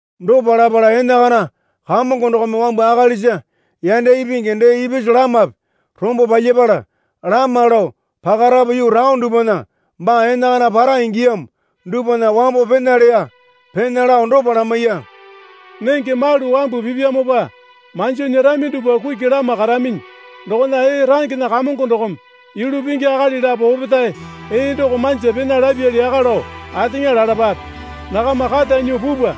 Dopa lapala enakana Kamongo dokome wambu akalisa yanda ipingi dee ipisu lamape rombo palyapala lama lao pakarapu yuu taone dupwana baa enakana para ingiyamo dupwana wambo pena leya. Pena lao dopa lamaiya. Nenge malu wambu pipyamopa manjo nyerami dupwa kuki lama karaminyi. Dokona ee rangena kamongo dokome yulu pingi akali lapo opetae ee doko manja pena lapyali yaka lao ateŋa lalapape. Nakama kata nyuo pupwa.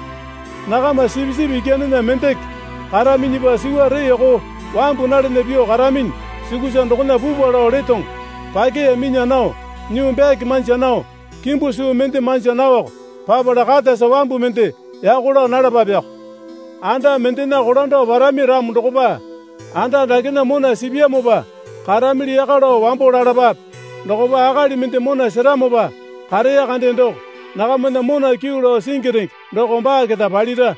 Nakama sipisipi ikyanena mendeke karaminyipa suwa reeko wambu nalana pyuo karaminyi sukusa dokona pupwa lao letoŋo. Pakeya minya nao nyuu byake manja nao kimbu suu mende manja naoko papala katasa wambu mende yako laa nalapapeko. Anda mendena kolando parami ramo dokopa, Anda dakena mona sipyamopa karamili yaka lao wambo lalapape. Dokopa akali mende mona seramopa kareya kande doko nakamana mona kyuu lao singi renge doko baa keta palira.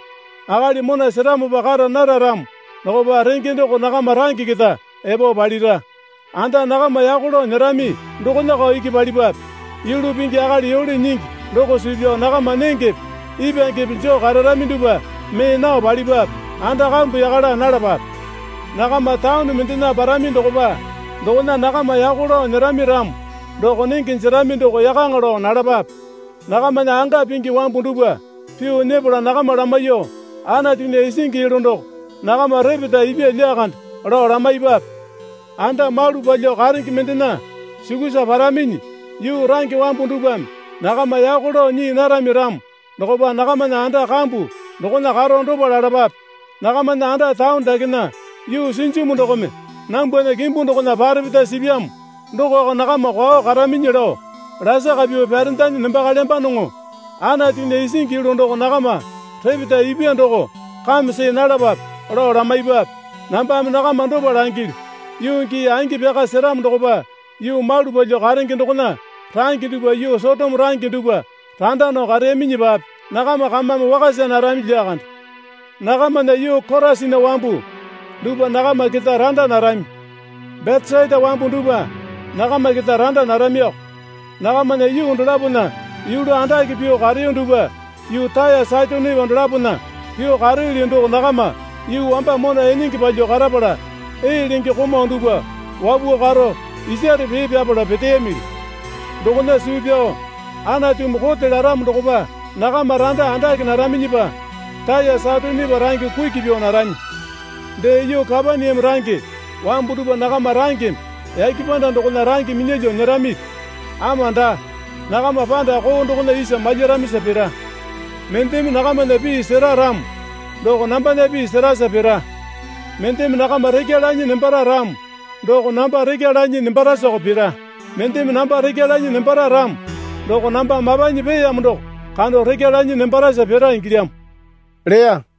Akali mona seramopa kara nara ramo dokopa renge doko nakama range keta epo palira. Anda nakama yako lao nyerami dokonako iki palipwape. Yulu pingi akali yole nyingi doko suu pyao nakama nengepe ipwangepe joo kararami dupwa mee nao palipwape. Anda kambu yaka laa nalapape. Nakama taone mendena parami dokopa dokona nakama yako lao nyerami ramo doko nenge jerami doko yakaŋa lao nalapape. Nakamana anga pingi wambu dupwa pyuo nyepala nakama lamaiyuo, Anatunya isingi yulu doko nakama repeta ipya lyakande, lao lamaipape. Anda malu palyuo karenge mendena sukusa paraminyi yuu range wambu dupwame nakama yako lao nyii narami ramo dokopa nakamana anda kambu dokona karo dopa lalapape. Nakamana anda taone dakena yuu sinjimu dokome nambwana kimbu dokona parepeta sipyamo dokoko nakama kwao karaminyi lao lasaka pyuo pyarendanyi nembakalyambanoŋo. Anatunya isingi yulu doko nakama repeta ipwa doko kame see nalapape, lao lamaipwape. Nambame nakama dopa langilyu, Yuu gii angi pyaka seramo dokopa yuu malu palyuo karenge dokona range dupwa yuu Sotoma range dupwa randa nao kareyaminyipape nakama kamame wakasa narami lyakande. Nakamana yuu Korasina wambu dupwa nakama keta randa narami. Betesaita wambu dupwa nakama keta randa naramiko. Nakamana yuu dolapona yulu andake pyuo kareyo dupwa yuu Taya Saitonepa dolapona pyuo kareyoli doko nakama yuu wamba mona enenge palyuo karapala ee lenge komau dupwa wapuo karo isare pee pyapala peteyamili. Dokona suu pyao Anatumi kote laramo dokopa nakama randa andake naraminyipa Taya Saitonepa range kuki pyuo narami. Dee, yuu Kapaneame range wambu dupwa nakama rangeme yake panda dokona range minyalyuo nyeramipi? Ama daa, nakama panda koo dokona isa malyaramisa pira. Mendeme nakamana pii sera ramo doko nambana pii serasa pira. Mendeme nakama rekya lanyi nembara ramo doko namba rekya lanyi nembarasako pira. Mendeme namba rekya lanyi nembara ramo doko namba mapanyi peeyamo doko kando rekya lanyi nembarasa pira ingilyamo leya.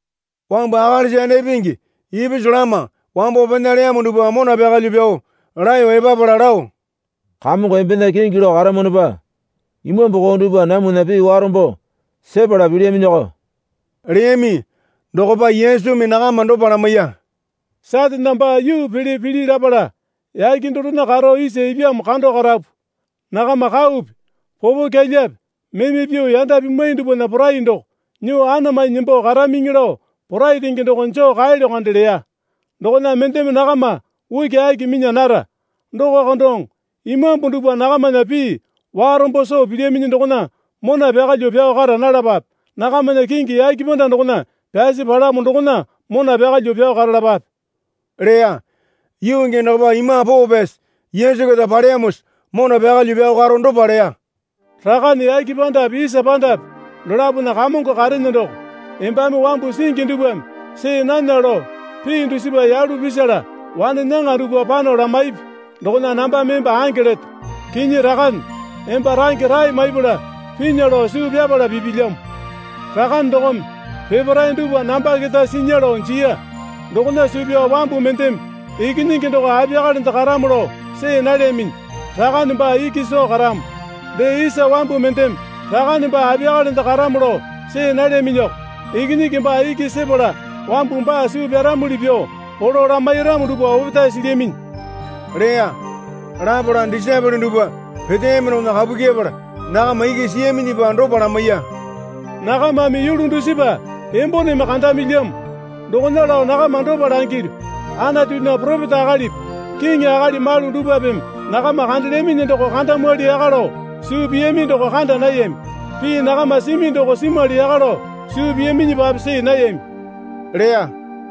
Wambu akalisa yanda ipingi ipisu lama wambo pena leyamo dupwa mona pyakalyuo pyao laeyo epapala lao, Kamongo embena kingi lao karamwanopa imambu koo dupwa namwana pii warombo sepala pilyaminyiko leyami. Dokopa Yesumi nakama dopa lamaiya. Satane baa yuu pele pili lapala yake dorena karo isa ipyamo kando karapu. Nakama kaupi popokyalyape meme pyuo yanda pimwai dupwana porai doko nyuo anamanyi nembo karamiŋi lao porai renge doko joo kaelyo kande leya. Dokona mendeme nakama ukiaki minya nara. Dokoko doŋo imambu dupwa nakamana pii warombo soo pilyaminyi dokona mona pyakalyuo pyao kara nalapape. Nakamana kingi yake panda dokona pyasi palamo dokona mona pyakalyuo pyao karalapape, leya. Yuu gii dokopa Imambu Poo Pyasi Yesu keta paleyamosa mona pyakalyuo pyao karo dopa leya. Rakane yake pandape isa pandape dolapona Kamongo karene doko, embame wambu singi dupwame see nana lao pii dusipa yalu pisala wane nyaŋa dupwa pano lamaipi dokona nambame emba ange leto. Kinyi Rakane, emba range rae maipala pinya lao suu pyapala pipilyamo. Rakane dokome peparae dupwa namba keta sinya lao jiya. Dokona suu pyao wambu mendeme Ikinyingi doko apiyakalende karamo lao see nalyaminyi. Rakane baa iki soo karamo. Dee isa wambu mendeme Rakane baa apiyakalende karamo lao see nalyaminyiko. Ikinyingi baa iki sepala wambu baa suu pyaramuli pyuo polo lamairamo dupwa opetae silyaminyi leya. Lapala disaepole dupwa peteyami dokona kapu kyepala nakama iki siyaminyipa dopa lamaiya. Nakamame yulu dusipa emboneme kandamilyamo. Dokona lao nakama dopa langilyu, Anatunya poropeta akalipi kiŋi akali malu dupwapeme nakama kandelyaminyi doko kandamwali yaka lao suu piyami doko kanda nayami. Pii nakama simi doko simwali yaka lao suu piyaminyipape see nayami leya.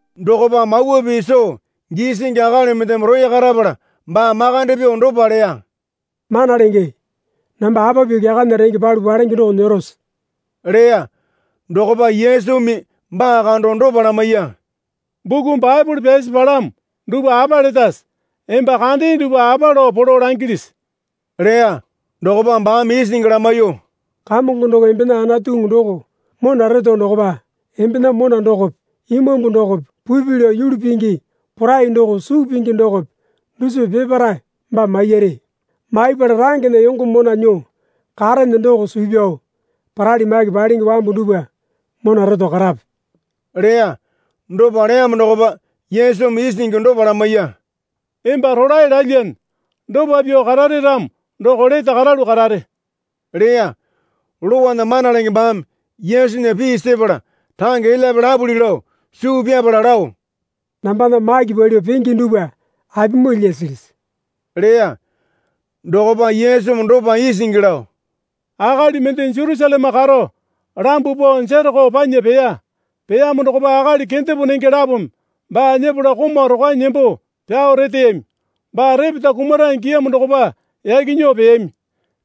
Dokopa Mawa Pii soo gisingi akali mendeme roya karapala baa makande pyuo dopa leya. Mana Lenge, namba apa pyuo kyakana renge palu palenge doko nyerose? leya. Dokopa Yesumi baa kando dopa lamaiya. Buku Baepole pyasi palamo dupwa apa letase? Emba kandee dupwa apa lao polo langilisi? leya. Dokopa baame isingi lamaiyuo, Kamongo doko embena Anatuŋu doko mona reto dokopa embena mona dokope imambu dokope pupi lao yulu pingi porai dokope suu pingi dokope dusipa peparae baa maiyare. Maipala rangena yongo mona nyuo karene doko suu pyao parali maki palenge wambu dupwa mona reto karape leya. Dopa leyamo dokopa Yesumi isingi dopa lamaiya. Emba rolae lalyane. Dopa pyuo karare ramo doko lete karalu karare leya. Lowana mana lenge baame Yesunya pii sepala range elyape lapuli lao suu pyapala lao, Nambana maki palyuo penge dupwa apimoo lyasilisi? leya. Dokopa Yesumi dopa isingi lao, Akali mende Jerusaleme karo lambuo pao Jereko panya peya. Peyamo dokopa akali kendepo nenge lapome baa nyepala komau rokwanyi nembo pyao reteyami. Baa repeta kumara ingiyamo dokopa yaki nyuo peyami.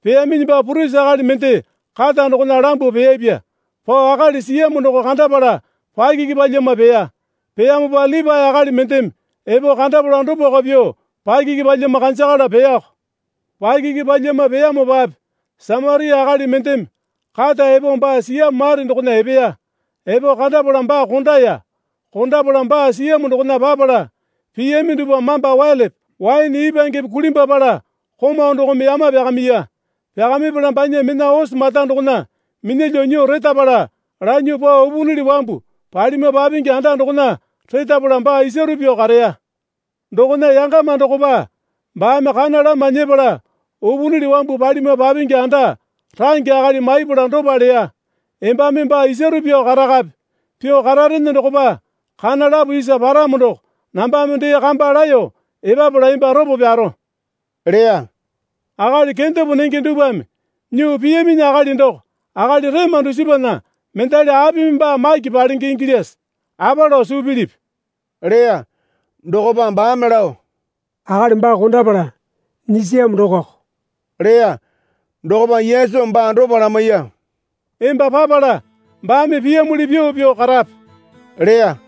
Peyaminyipa purisi akali mende kata dokona lambuo peyapya. Pao akali siyamo doko kandapala pakiki palyama peya. Peyamopa Lipae akali mendeme epo kandapala dopako pyuo pakiki palyama kanjakalo peyako. Pakiki palyama peyamopape Samaria akali mendeme kata epo baa siyamo mare dokona epeya. Epo kandapala baa kondaya. Kondapala baa siyamo dokona papala piyami dupwa mamba welepe waene ipwangepe kulimbwapala komau dokome yama pyakamiya. Pyakamipala banya mena ose mata dokona minyalyuo nyuo retapale lanyuo pao upunili wambu palima papingi anda dokona retapala baa isaru pyuo kareya. Dokona yangama dokopa baame kana lama nyepala upunili wambu palima papingi anda range akali maipala dopa leya. Embame baa isaru pyuo karakape. Pyuo kararene dokopa kana lapo isa paramo doko nambame dee kamba laeyo epapala emba ropo pyaro leya. Akali kendepo nenge dupwame nyuo piyaminyi akali doko akali rema dusipana mendali apimi baa maki palenge ingilyase? Apa lao suu pilipi? leya. Dokopa baame lao, Akali baa kondapala nyisiyamo dokoko, leya. Dokopa Yesumi baa dopa lamaiya. Emba papala baame piyamuli pyuo pyuo karape leya.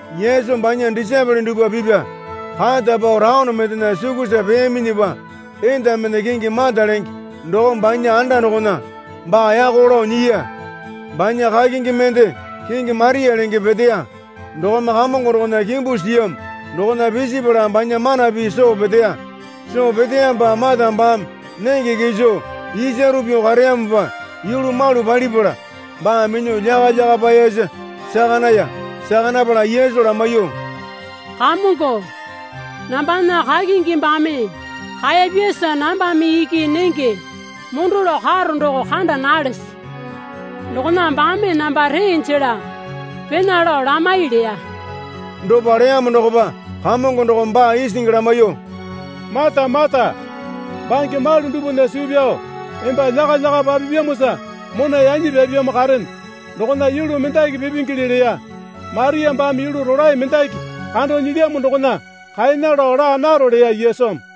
Yesu banya disaepole dupwa pipa kata pao taone mendena sukusa peyaminyipa enda mende kingi Mata lenge dokome banya anda dokona baa yako lao nyiya. Banya kakingi mende kingi Maria lenge peteya. Dokome Kamongo dokona kimbu siyamo dokona pisipala banya mana pii soo peteya. Soo peteyamopa Mata baame nenge kiso isaru pyuo kareyamopa yulu malu palipala baa minyuo lyakalyaka paeyasa saka naya. Saka napala Yesu lamaiyuo, Kamongo, nambana kakingi baame kaeyapyasa nambame iki nenge mondo lao karo doko kanda nalese? Dokona baame namba ree jela pena lao lamai leya. Dopa leyamo dokopa Kamongo dokome baa isingi lamaiyuo, Mata, Mata, bange malu dupwana suu pyao emba lyakalyaka papipyamosa mona yanyi pyapyamo karene. Dokona yulu mendaki pipingele leya. Maria baame yulu rolae mendaki kando nyilyamo dokona kaena lao laa naro leya Yesumi.